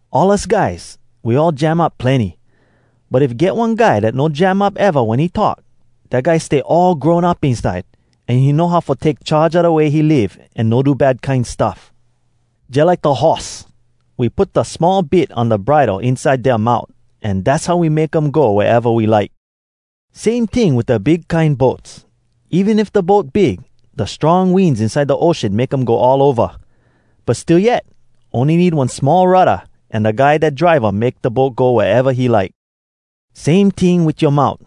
All us guys, we all jam up plenny. But if get one guy dat no jam up eva wen he talk, dat guy stay all grown up inside, an he know how fo take charge a da way he live an no do bad kine stuff. Jalike da horse: We put da small bit on da bridle inside dea mout, an dass how we make um go wea eva we like. Same ting wit da big kine boats. Even if da boat big, da strong winds inside da ocean make um go all ova. But still yet, ony need one small rudda, an da guy dat drive um make da boat go wea eva he like. Same ting wit yoa mout.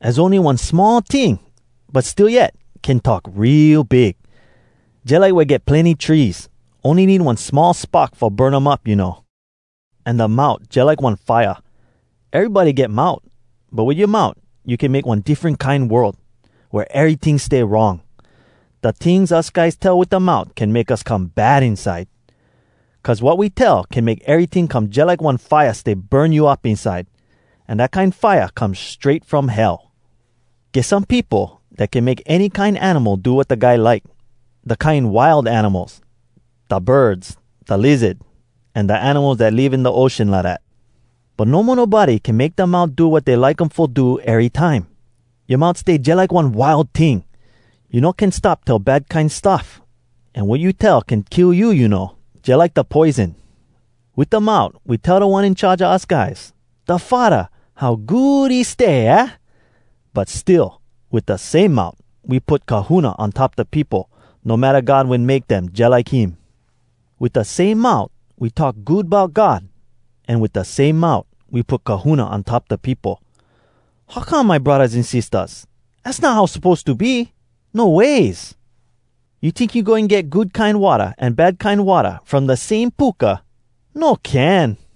Az ony one small ting, but still yet, can talk real big. Jalike wea get plenny trees. Ony need one small spark fo burn um up, you know. An da mout jalike one fire. Erybody get mout, but wit yoa mout you can make one diffren kine world, wea eryting stay wrong. Da tings us guys tell wit da mout can make us come bad inside. Cuz wat we tell can make eryting come jalike get one fire stay burn you up inside. An dat kine fire come strait from Hell. Get some peopo dat can make any kine animal do wat da guy like—da kine wild animals, da birds, da lizard, an da animals dat live in da ocean, lidat. But no mo nobody can make dea mout do wat dey like um fo do erytime. Yoa mout stay jalike one wild ting. You no can stop tell bad kine stuff, an wat you tell can kill you, you know, jalike da poison. Wit da mout we tell Da One In Charge a us guys, da Faddah, how good he stay, aah? But still, wit da same mout we put kahuna on top da peopo, no matta God wen make dem jalike him. Wit da same mout we talk good bout God, an wit da same mout we put kahuna on top da peopo. How come, my braddahs an sistahs? Az not how suppose to be! No ways! You tink you goin get good kine watta an bad kine watta from da same puka? No can!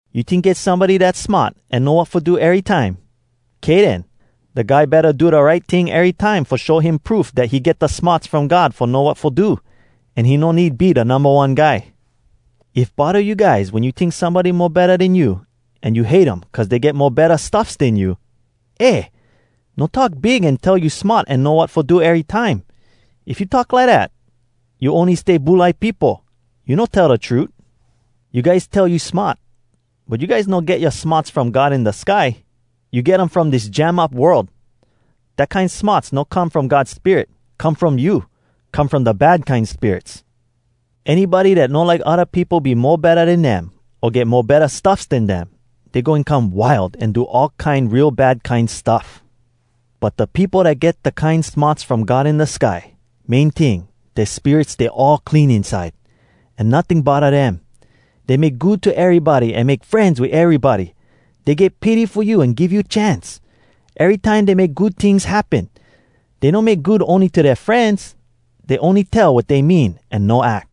You tink get somebody dat smart an know wat fo do erytime? Kay den. Da guy betta do da right ting erytime, fo him show proof dat he get da smarts from God fo know wat fo do, an he no need be da numba one guy. If bodda you guys wen you tink somebody mo betta den you, an you hate um cuz dey get mo betta stuffs den you, eh! no talk big an tell you smart an know wat fo do erytime. If you talk lidat, you ony stay bulai peopo. You no tell da trut. You guys tell you smart, but you guys no get yoa smarts from God in da sky, you get um from dis jam up world. Dat kine smarts no come from God Spirit, come from you, come from da bad kine spirits. Anybody dat no like odda peopo be mo betta den dem, o get mo betta stuffs den dem, dey goin come wild an do all kine real bad kine stuff. But da peopo dat get da kine smarts from God in da sky, main ting, dea spirit stay all clean inside. An notting bodda dem. Dey make good to erybody an make frenz wit erybody. Dey get pity fo you an give you chance. Erytime dey make good tings happen. Dey no make good ony to dea frenz. Dey ony tell wat dey mean an no ack.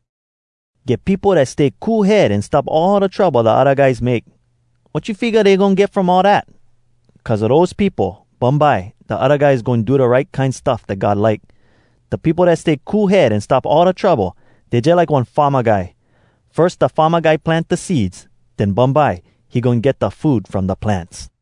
Get peopo dat stay cool head an stop all da trouble da odda guys make. Wat you figga dey goin get from all dat? Cuz a dose peopo, bumbye da odda guys goin do da right kine stuff dat God like. Da peopo dat stay cool head an stop all da trouble, dey jalike one farma guy. Firs, da farma guy plant da seeds, den bumbye, he get da food from da plants.